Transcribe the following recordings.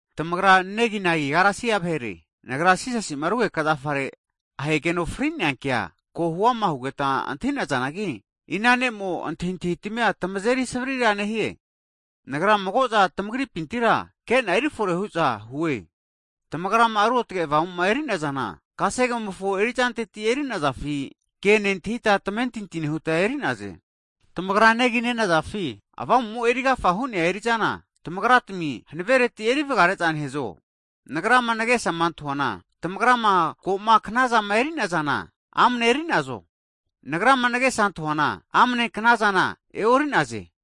Tamagra neginagi Galesia vahere, Nagra Jisasima rugeka zafare ahegeno fri'nea kea ko huama hugeta antahi'nazanagi, ina ne'mo antahintahitamia tamazeri savrira nehie? Nagra mago'za tamagripintira kena erifore hu'za hue. Tamagrama Ruotge Avamuma eri'nazana, kasegemofo erizanteti eri'nazafi, ke nentahita tamentinti nehuta eri'naze. Tamagra negi nenazafi? Avamumo eri agafa hu'nea eri'zana, tamagratami hanavereti erivgare'za nehazo? Nagrama nagesama antahuana tamagrama ko'ma knazama eri'nazana, amane eri'nazo? Nagrama nagesa antahuana amne knazana e'ori'naze.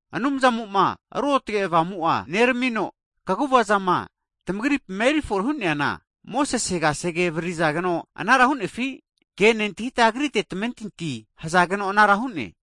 Anumzamo'ma Ruotge Avamu'a neramamino, kaguvazama tamagripima erifore hu'neana, Mosese kasege avaririzageno anara hu'nefi? Anumzamofo ke nentahita, Agrite tamamentinti hzageno anara hu'ne?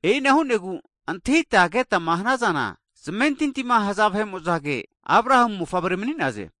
E'ina hu'negu antahita ketama hanazana, zamentintima haza vahe'mozage, Abrahamu mofavre mni'naze.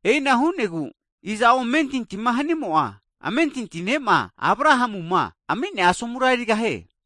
E'ina hu'negu iza'o amentintima hanimo'a, amentinti ne'ma Abrahamuma ami'nea asomura erigahie.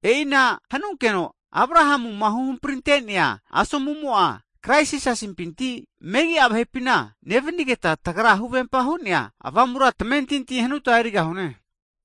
E'ina hanunkeno Abrahamuma huhampritenea asomumo'a, Kraisi Jisasimpinti megia vahepina nevanigeta, tagra huvempa hu'nea Avamura tamentinti hanuta erigahune.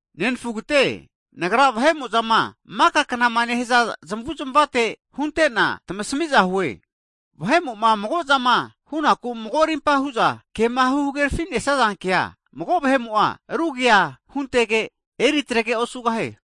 Nenfugate, Nagra vahe'mo'zama maka knama nehaza zmavuzmavate hunte'na tamasamiza hue, vahe'mo'ma mago'zama hu'naku mago rimpama hu'za kema hagerafinesaza kea, mago vahe'mo'a rugea huntege, eri atrege osugahie.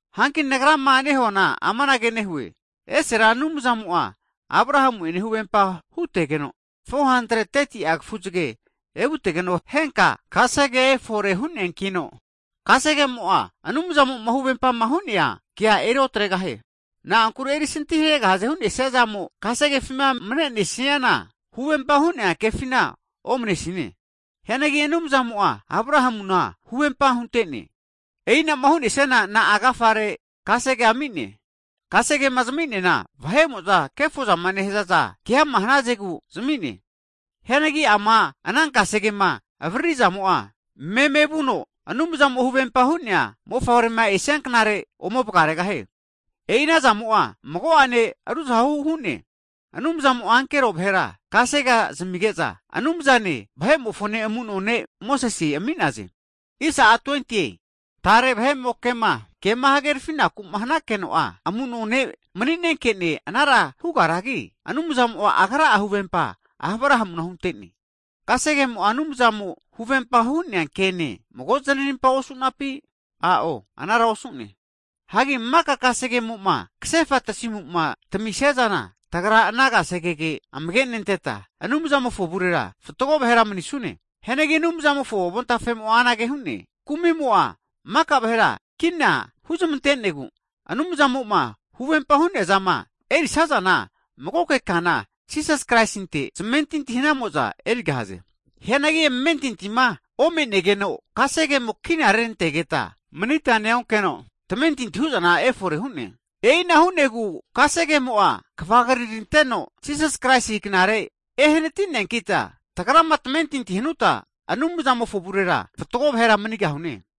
Hanki Nagrama nehuana amanage nehue, esera Anumzamo'a Abrahamu'ene huvempa hutegeno, 430ti'a kafuzge evutegeno, henka kasegea efore hu'neankino, kasegemo'a Anumzamo'ma huvempama hu'nea kea eri otregahie. Na'ankure erisanti haregahaze hunesiazamo kasegefima manenesiana, huvempa hu'nea kefina omnesine. Hianagi Anumzamo'a Abrahamuna huvempa hunte'ne. E'inama hu'nesiana, na'a agafare kasegea ami'ne? Kasegema zami'neana vahe'mo'za kefozama nehazaza keama hnazegu zami'ne. Hianagi ama ana kasegema avaririzamo'a memevuno, Anumzamo huvempama hu'nea Mofavrema esia knare ome vgaregahie. E'i anazamo'a mago'ane ruzahu hu'ne. Anumzamo'a ankero vahera kasegea zamige'za, Anumzane, vahe'mofone amuno ne' Mosese ami'naze. Tare vahe'moke kema hagerafinaku'ma hanunkeno'a, amuno ne' mni'nenkene anara hugaragi, Anumzamo Agra'a huvempa Abrahamuna hunte'ne. Kasegemo'a Anumzamo huvempa hu'nea kene mago znarimpa osu'napi? A'o, anara osu'ne! Hagi maka kasegemo'ma kasefa tasimuma tamisiana, tagra ana kasegege amage'nenteta Anumzamofo avurera fatgo vahera manusine. Hianagi Anumzamofo avontafemo'a anage hu'ne, Kumi'mo'a maka vahera kina huzmante'negu, Anumzamo'ma huvempa hu'neazama erisazana magoke kana, Jisasi Kraisinte zamentinti hanamo'za erigahaze. Hianagi amentintima omenegeno, kasegemo kina rerantegeta manita neonkeno tamentinti hu'zana efore hu'ne. E'ina hu'negu kasegemo'a kvagriranteno Jisas Kraisi knare ehnati'neankita, tagrama tamentinti hanuta Anumzamofo avurera fatgo vahera manigahune.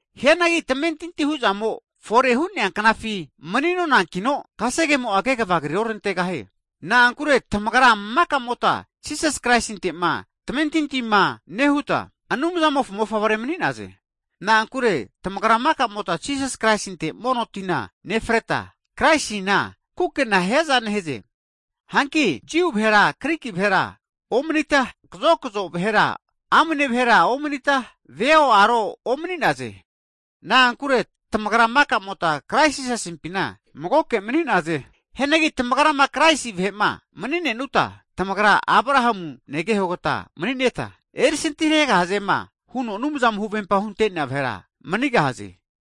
Hianagi tamentinti hu'zamo fore'ma hu'nea knafi mni'nonankino, kasegemo'a kegva kriorantegahie. Na'ankure tamagra maka'mota Jisas Kraisinte'ma tamentintima nehuta, Anumzamofo mofavre mani'naze. Na'ankure tamagra maka'mota Jisas Kraisinte mono tina nefreta, Kraisina kukena hiaza nehaze. Hanki Jiu vahero Griki vahera omnita, kazokzo vahe'ene amne vahera omnita, veo aro omni'naze. Na'ankure tamagra maka'mota Kraisi Jisasimpina magoke mani'naze. Hagi tamagrama Kraisi vahe'ma mni'nenuta, tamagra Abrahamu negehogata mni'neta, erisanti haregahazema huno Anumzamo huvempa hunte'nea vahera manigahaze.